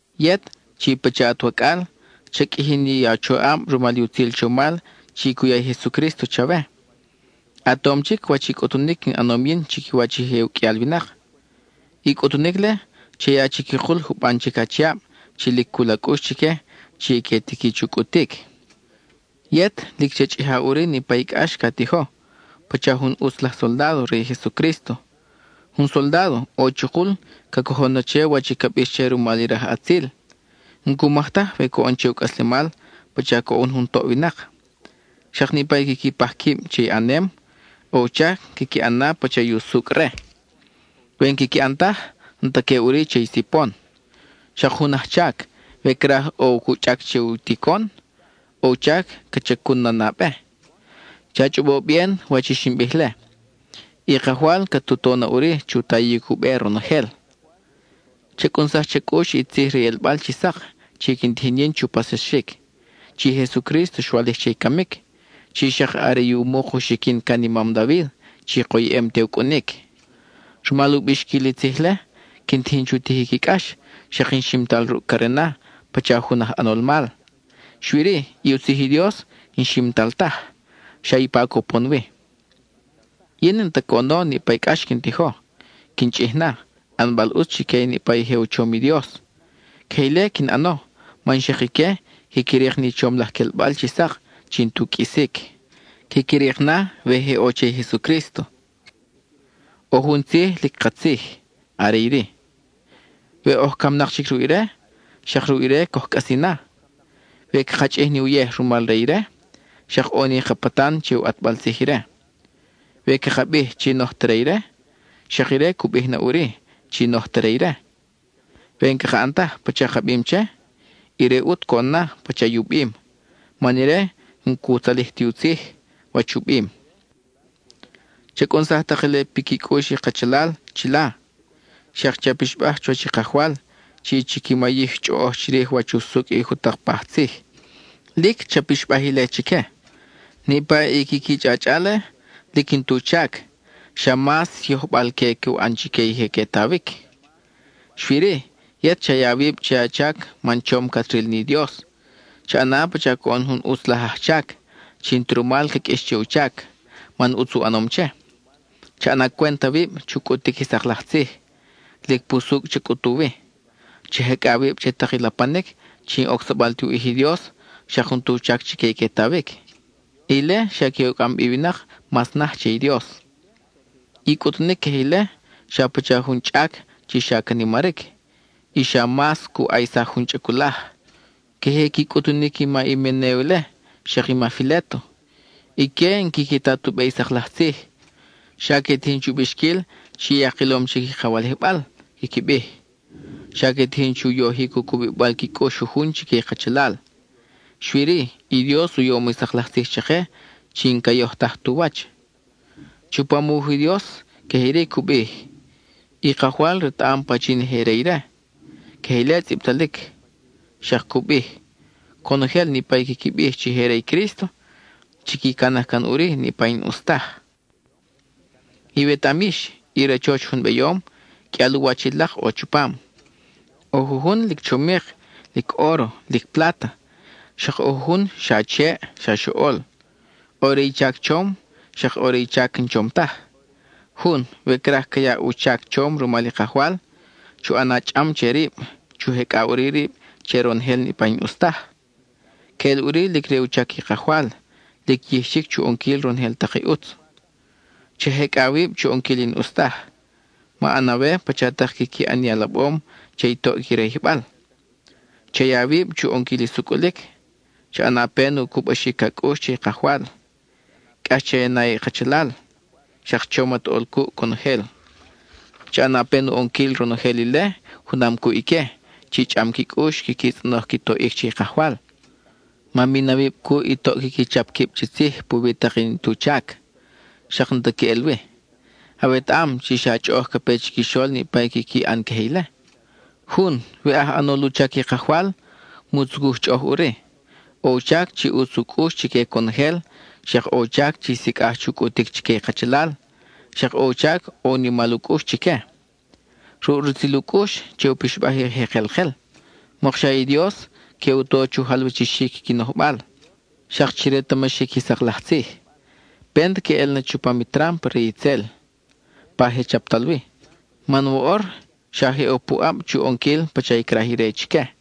Yet, chi pacha at wacʼal, cha qʼuiji ni a choʼab rumal i utzil chomal chi cu ya i Jesucrísto chawe. A tom chic wach i cʼutunic in ʼanom yin chiquiwach je u qʼuial winak. I cʼutunic-le, cha ya chiquikul juban chic achiab chi lic cul a cʼux chique chi que tiqui chu cʼutic. Yet, lic cha chʼija ʼuri niʼpa i cʼax ca tijo pacha jun ʼutz laj soldádo re i Jesucrísto. Jun soldádo, ʼo chukul ca cojon na che wach ca bix che rumal i rajʼatzil; n-cumaj taj we coʼon che u cʼaslemal pacha coʼon jun toʼ winak. Xak niʼpa i quiqui paj quib che ʼanem, ʼo u chac quiqui ʼan pacha i usucʼ re. We n-quiqui ʼan taj, n-ta que ʼuri che i sipon. Xak jun ajchac, we craj ʼo cu chʼac che u ticon, ʼo u chac ca chacun na nabe. Cha chʼobo bien wach i xin bij-le; i Kajwal cat u to na ʼuri chu tayic u be ronojel. Cha cʼunsaj cha cʼux i tzij re i ʼelbal chi sak chi quin tijin yin chu paxsaxic, chi i Jesucrísto xwalij che i camic, chi xak are i u muk u xiquin can i mam David chi koyʼem te u cʼunic. Rumal u bixquil i tzij-le, quin tijin chu tijic i cʼax, xak in ximtal ruʼ carena pacha jun aj ʼanol mal; xui-ri, i u tzij i Dios n-ximtal taj, xa ipa cupon wi. Yin n-ta coʼono niʼpa i cʼax quin tijo, quin chʼij na, ʼanbal ʼutz chique niʼpa i je u chom i Dios. Queje ile quin ʼano man xak ique quiqui rik ni chom laj quelbal chi sak chi n-tu qʼuisic; quiqui rik na we je ʼo che i Jesucrísto. ʼO jun tzij lic katzij; are iri: We oj camnak chic ruʼ ire, xak ruʼ ire coj cʼasi na; We caka chʼij ni uyej rumal re ire, xak ʼo ni ka patan che u ʼatbal tzij ire. We caka bij chi n-oj ta re ire, xak ire cu bij na ʼuri chi n-oj ta re ire. We n-caka ʼan taj pacha ka bim che, ire ʼut coʼon na pacha i u bim, man ire n-cu tzalij ti u tzij, wach u bim. Cha cʼunsaj tak ile piqui cʼux i kachalal chila, xak che a pixbaj chuwach i Kajwal chi chiqui mayij chʼoʼoj chirij wach usucʼ i jutak paj tzij; lic cha pixbaj ile chique. Niʼpa i quiqui chʼachʼa-le, lic n-tu chac, xa mas yojbal-que cu ʼan chique i que tawic. Xui-ri, yet cha ya awib che a chac man chom cat ril ni Dios; cha ʼana pacha coʼon jun ʼutz laj ajchac, chi n-ta rumal ca qʼuix che u chac, man ʼutz u ʼanom che. Cha ʼana cwent awib chu cʼutic i sak laj tzij; lic pusucʼ cha cʼutu wi. Cha jecʼa awib che tak i lapanic chi n-ocsabal ti u ʼij i Dios xak n-tu chac chique i que tawic. Ile xa que u cʼam bi i winak mas naj che i Dios. I cʼutunic queje ile, xa pacha jun chʼac chi xa ca nimaric, y xa mas cu ʼaysaj jun chʼaculaj. Queje qui cʼutunic i ma Himenéo ile, xak i ma Filéto. Ique n-quiqui ta tu be i sak laj tzij; xa que tijin chu bixquil chi ya kilom chic i ka walijbal, quiqui bij. Xa que tijin chu yojic u cubibal qui cʼux jujun chique i kachalal. Xui-ri, i Dios u yom i sak laj tzij chake chi n-ca yojtaj tu wach. Chupam u wuj i Dios queje iri cu bij: “I Kajwal retaʼam pachin i je re ire.” Queje ile tzʼibtalic; xak cu bij: “Conojel niʼpa i quiqui bij chi je re i Crísto, chiqui canaj can ʼuri niʼpa i n-ʼus taj.” Iwetaʼam yix, i rachoch jun beyom, qʼuial u wach i lak ʼo chupam. ʼO jujun lic chomik, lic óro, lic pláta, xak ʼo jujun xa cheʼ, xa xoʼol. ʼO re i chac chom, xak ʼo re i chac n-chom taj. Jun, we craj ca yaʼ u chac chom rumal i Kajwal, chu ʼana chʼam che rib, chu jecʼa ʼuri rib che ronojel niʼpa i n-ʼus taj; queʼel ʼuri lic re u chac i Kajwal, lic yij chic chu ʼonquil ronojel tak i ʼutz. Cha jecʼa awib chu ʼonquil i n-ʼus taj, ma ʼan awe pacha tak quiqui ʼan i alabom che i toʼ qui rayijbal. Cha ya awib chu ʼonquil i sucʼulic; cha ʼana pen u cubaxic a cʼux che i Kajwal, cʼax che a na i kachalal; xak chom at ʼol cuʼ conojel. Cha ʼana pen u ʼonquil ronojel ile junam cuʼ ique chi chʼam qui cʼux quiqui tzʼonoj qui toʼic che i Kajwal. Ma min awib cuʼ i toʼ quiqui chap quib chi tzij puwi tak i n-tu chac xak n-ta queʼel wi. Awetaʼam chi xa chʼoʼoj ca pe chiquixol niʼpa i quiqui ʼan queje ile. Jun, we aj ʼanol u chac i Kajwal, mu tzucuj chʼoʼoj ʼuri; ʼo u chac chi ʼutz u cʼux chique conojel, xak ʼo u chac chi sicʼaj chu cʼutic chique i kachalal, xak ʼo u chac ʼo u nimal u cʼux chique. Ruʼ rutzil u cʼux, che u pixbaj i je kelkel, mokxa i Dios que u to chu jalwachixic qui nojbal, xak chi retamaxic i sak laj tzij. Pent que ʼel na chupam i trámpa re i itzel, pa je chaptal wi; man woʼor xa je ʼo puʼab chu ʼonquil pacha craj ire chique.